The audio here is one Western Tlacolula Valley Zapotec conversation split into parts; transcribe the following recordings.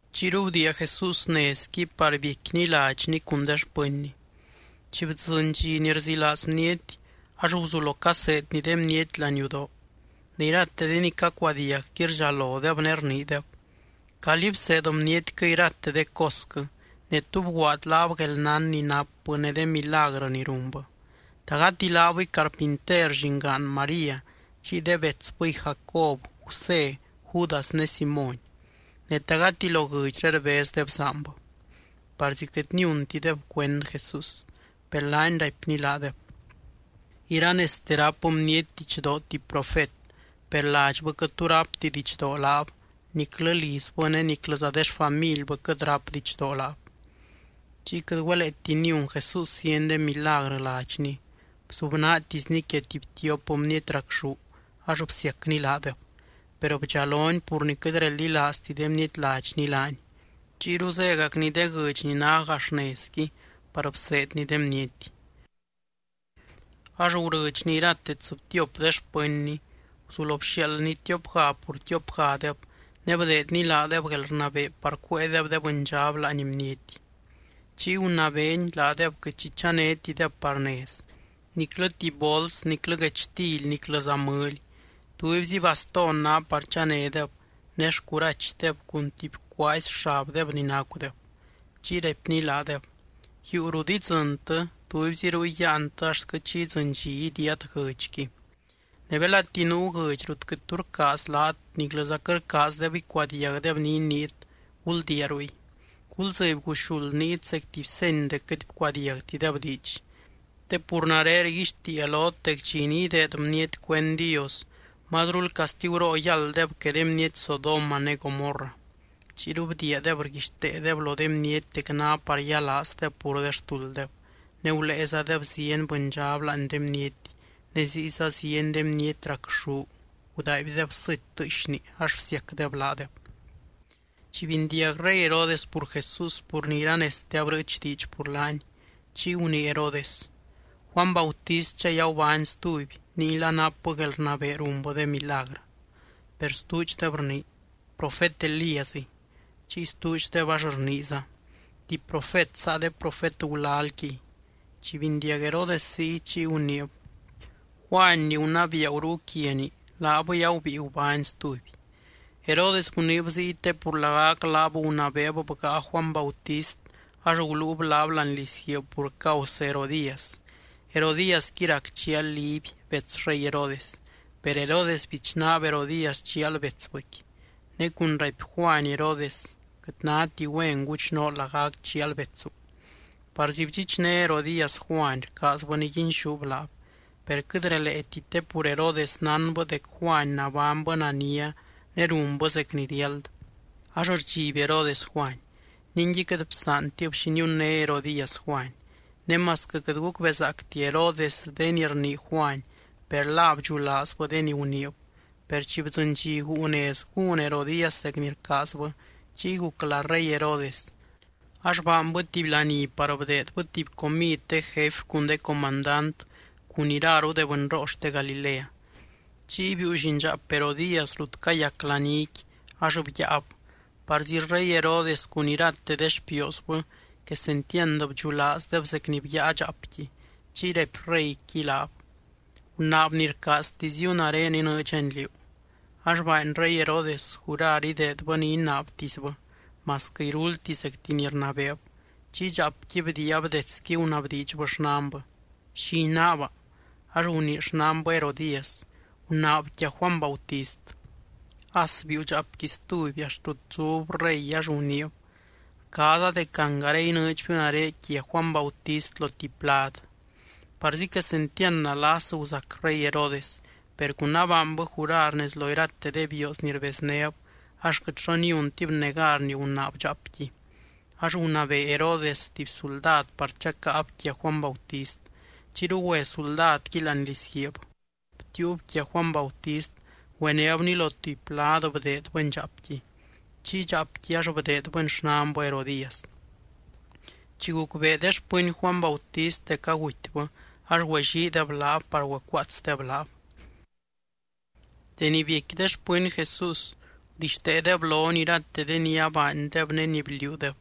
Chiyru bdiia Jesús nezqui par biecquiny ladxny cun de xpɨnny. Chi bdzɨny dxi ni rzilaaz bniety, ax guzulo caseedny de bniety láani yudoo. Ne irate de ni cacuadiagqui rdxalodeb ne rniideb: —¿Calí bseed bnietquɨ irate de cosquɨ? Ne, ¿tú bguaad laab guelnán ni napbɨ ne de milagrɨ ni runbɨ? ¿Ta gati laabɨy carpinter, llingaan María chiy de betsbɨy Jacob, Gusé, Judas ne Simóny? Ne, ¿ta gati lo guɨdxré rbez de bzaanbɨ? Parzi quɨt niuntideb cuend Jesús. Per laany raipny laadeb: —Iranezte ráp bniety didxdoo tuby profet. Per ladxbɨ quɨt tu rápti didxdoo laab, niclɨ lizbɨ ne niclɨza de xfamilbɨ quɨt ráp didxdoo laab. Chiy quɨt güeleeti niun Jesús zieny de milagrɨ ladxny. Bzubnaatisny quia tuby tiop bniety racxú ax bsiacny laadeb. Per bdxalony pur ni quɨt reldilaazti de bniety ladxny laany. Chiyru zégacny de guɨdx ni ná gax nezqui par bseedny de bniety. Ax gurɨdxny irate tsɨbtiop de xpɨnny, guzulo bxiaaldny tiopga pur tiopgadeb. Ne bdeedny laadeb guelrnabee par cuéedeb de bɨndxab láani bniety. Chiy gunabeeny laadeb quɨt xi chanétideb par nez, niclɨ tuby bols niclɨ guechtily niclɨza mɨly. Tubyzi bastón ná par chanédeb ne xcurachdeb cun tuby cuaazy xabdeb ni nacudeb. Chiy raipny laadeb: —Yuu rut idzɨntɨ, tubyzi ruy yáantɨ axtquɨ chi idzɨny dxi idiiat guɨdxqui. Ne belati nuu guɨdx rut quɨt tu rcaaz laat niclɨza quɨt rcaazdeb icuadiagdeb ni iniit, guldiia ruy. Guldzɨby guxuld niit zec tuby seny dec quɨt bcuadiagtideb diidx, te pur nare rguixtiia lot dec dxi ni ideed bniety cuend Dios, mazrul castiguroo yálddeb que de bniety Sodoma ne Gomorra. Chiyru bdiiadeb rguixteedeb lo de bniety dec ná par yialaazdeb pur de xtulddeb. Ne guléezadeb zieny bɨndxab láani de bniety, ne ziyza zieny de bniety racxú gudaaibdeb sɨty tɨɨxni ax bsiacdeb laadeb. Chi bindiag rey Herodes pur Jesús pur ni iranezte abrɨɨch diidx pur laany, chiy gunii Herodes: —Juany Bautistdxay agubány stuby ninguila napbɨ guelrnabee runbɨ de milagrɨ. Per stuudxdeb rnii: —Profet Elíasiy. Chiy stuudxdeb ax rniiza: —Tuby profet saa de profet gulalquiy. Chi bindiag Herodes ziy, chiy guniib: —Juany ni gunabiia gurúu quiani, laabɨy agubíi gubány stuby. Herodes guniib ziy, te pur lagac laab gunabeeb bgáa Juany Bautist ax guluub laab láani lizguiib pur causɨ Herodías. Herodíasqui rac chial Liby bets rey Herodes. Per Herodes bichnaab Herodías chial betsbɨqui. Ne cun raipy Juany Herodes: —Quɨt náti güen guchnoo lagac chial betsu. Parzi bdxichné Herodías Juany rcaazbɨ niguinxúb laab. Per quɨt releeti te pur Herodes nánbɨ dec Juany nabánybɨ nania ne runbɨ zec ni riáld, ax rdxiby Herodes Juany. Ningui, quɨt bsaantib xi niunné Herodías Juany. Ne masquɨ quɨt gucbezaacti Herodes de ni rnii Juany, per la bdxulaazbɨ de ni guniib. Per chi bdzɨny dxi guu nez gún Herodías zec ni rcaazbɨ, chiy guc lá rey Herodes. Ax baanbɨ tuby laní par bdeedbɨ tuby comid de jefy cun de comandant cun iraru de bɨnroo xte Galilea. Chiy biiu llindxaap Herodías rut cayac laníqui ax byaab. Parzi rey Herodes cun irate de xpioosbɨ quesentiand bdxulaazdeb zec ni byaa dxaapqui. Chiy raipy reyqui laab: —Gunaab ni rcaaztiziu, nare inɨɨdxani liú. Ax baany rey Herodes jurar ideedbɨ ni inaabtisbɨ, masquɨ iruldti zecti ni rnabeeb. Chiy dxaapqui bdiiab detsqui gunabdiidxbɨ xnanbɨ: —¿Xi inaaba? Ax gunii xnanbɨ Herodías: —Gunaab quia Juany Bautist. As biiu dxaapqui stuby axt rut zub rey ax guniib: —Rcaaza dec angare inɨɨdxbiu nare quia Juany Bautist lo tuby plad. Parzi quesentiand nalas guzac rey Herodes. Per cun abaanbɨ jurar nez lo irate de bioos ni rbeznéb ax quɨt xo niuntib negar ni gunaab dxaapqui. Ax gunabee Herodes tuby suldad par chacáab quia Juany Bautist. Chiyru güe suldadqui láani lizguiib, btiiub quia Juany Bautist güenébni lo tuby plad bdeedbɨni dxaapqui. Chiy dxaapqui ax bdeedbɨni xnanbɨ Herodías. Chi gucbee de xpɨny Juany Bautist dec agutybɨ ax güelliideb laab par güecuaatsdeb laab. Deni biecqui de xpɨny Jesús gudixteedeb lony irate de ni abaandeb ne ni bliuudeb.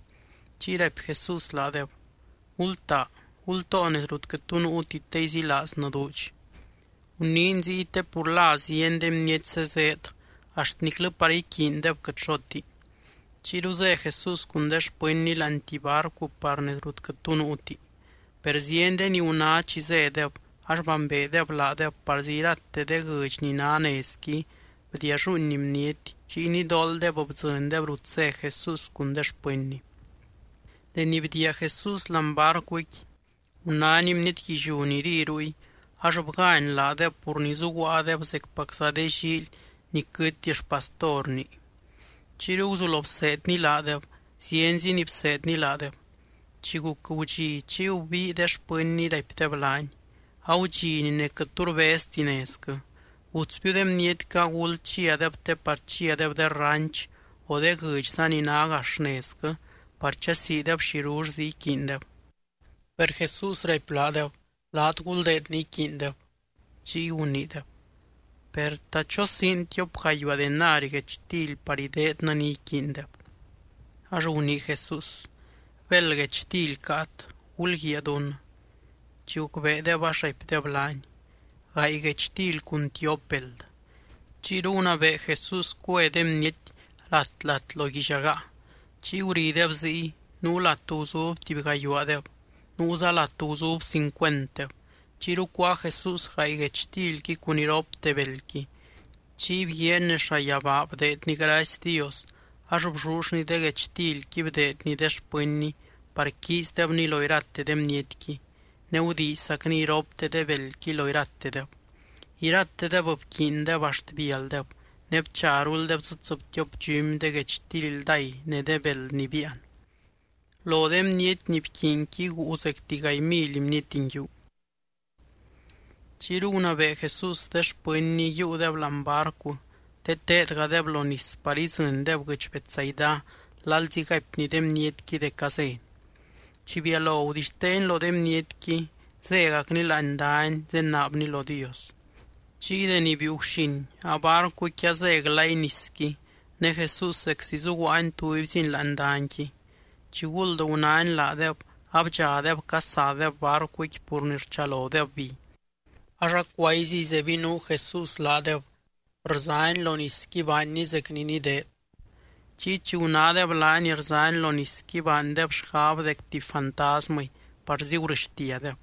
Chiy raipy Jesús laadeb: —Gultaa, gultoo nez rut quɨt tu nuuti te izilaaznɨ duudx. Guniiny ziy te pur la zieny de bniety zezeed, axt niclɨ par iquiindeb quɨt xoti. Chiyru zé Jesús cun de xpɨnny láani tuby barcu par nez rut quɨt tu nuuti. Per zieny de ni guná chi zédeb ax bambeedeb laadeb parzi irate de guɨdx ni ná nezqui bdialluuin bniety, chiy nidooldeb bdzɨndeb rut zé Jesús cun de xpɨnny. Deni bdiia Jesús láani barcuqui, gunány bniety guilliú ni ri ruy ax bgány laadeb pur ni zuguaadeb zecpacza de llíily ni quɨty xpastorni. Chiyru guzulo bseedny laadeb, zienzi ni bseedny laadeb. Chi guc gudxi, chiy gubii de xpɨnny raipdeb laany: —Agudxini ne quɨt tu rbezti nezquɨ. Gutsbiu de bnietquɨ aguld chiadeb te par chiadeb de ranch, o de guɨdxza ni ná gax nezquɨ par chasiideb xirullzi iquiindeb. Per Jesús raipy laadeb: —Laat guldeed ni iquiindeb. Chiy guniideb: —Per, ¿ta chosiin tiop gayuaa denari guechtily par ideednɨ ni iquiindeb? Ax gunii Jesús: —¿Béld guechtily caat? Gulguiaa dún. Chi gucbeedeb ax raipdeb laany: —Gaay guechtily cun tiop beld. Chiyru gunabee Jesús cue de bniety lat, lat lo guillagaa. Chiy gurideb ziy, nuu lat guzub tuby gayuaadeb nuuza lat guzub cincuentdeb. Chiyru cuáa Jesús gaay guechtilqui cun iropte beldqui. Chiy bguiaany nez llayabaa bdeedny gracy Dios ax bllullny de guechtilqui bdeedny de xpɨnny par quiizdebni lo irate de bnietqui, ne gudiizzacny iropte de beldqui lo iratedeb. Iratedeb bquiindeb axt bialdeb ne bcharuldeb dzɨ tsɨbtiop dxumy de guechtily ldáy ne de beld ni biian. Lo de bniety ni bquiinqui guu zecti gaay mily bniety nguiu. Chiyru gunabee Jesús de xpɨnny yiiudeb láani barcu te teedgadeb lo nis par idzɨndeb guɨdx Betsaida lalzi ni gaipny de bnietqui dec azény. Chi bialo gudixteeny lo de bnietqui, zégacny láani dany zenaabny lo Dios. Chiy deni biiu guxin, abarcuqui azé glay nisqui ne Jesús zeczi zuguaany tubyziny láani danyqui. Chiguld gunány laadeb, abdxadeb casadeb barcuqui, pur ni rchalodeb bi. Ax acuayziy zebinuu Jesús laadeb rzany lo nisqui baanny zec ni nideed. Chiy chi gunádeb laany rzany lo nisqui baandeb xgab dec tuby fantasmɨy parzi gurɨxtiadeb,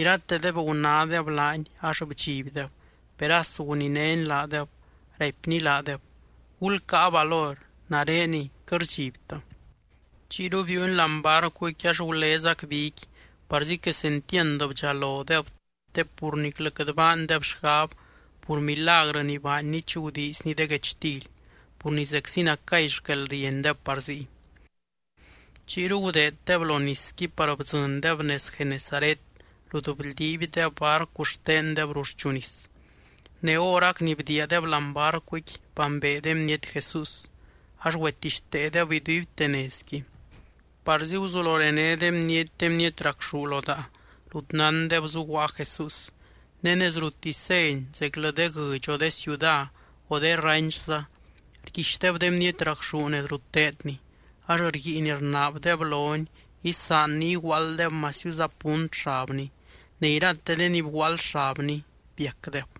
iratedeb gunádeb laany ax bdxibdeb. Per as guninény laadeb, raipny laadeb: —¡Gulcáa valor! ¡Nareniy, quɨt rdxibtɨ! Chiyru biiuny láani barcuqui ax gulezac biqui parzi quesentiand bdxalodeb te pur niclɨ quɨt baandeb xgab pur milagrɨ ni baanny chi gudiizny de guechtily, pur ni zeczi nacay xquelriendeb par ziy. Chiyru gudeeddeb lo nisqui par bdzɨndeb nez Genesaret rut bldiibdeb barcu xtendeb ruxchu nis. Ne horac ni bdiiadeb láani barcuqui, bambee de bniety Jesús ax güetixteedeb iduibte nezqui. Parzi guzulo rené de bniety de bniety racxú lo daa, rut nándeb zuguaa Jesús. Ne nez ruttisy zény, zeclɨ de guɨdx o de ciuda o de ranchza rguixdeb de bniety racxú nez rut teedny. Ax rguiin rnaabdeb lony isaanny iguaalddeb masiuza punt xabny, ne irate de ni bguaald xabny biacdeb.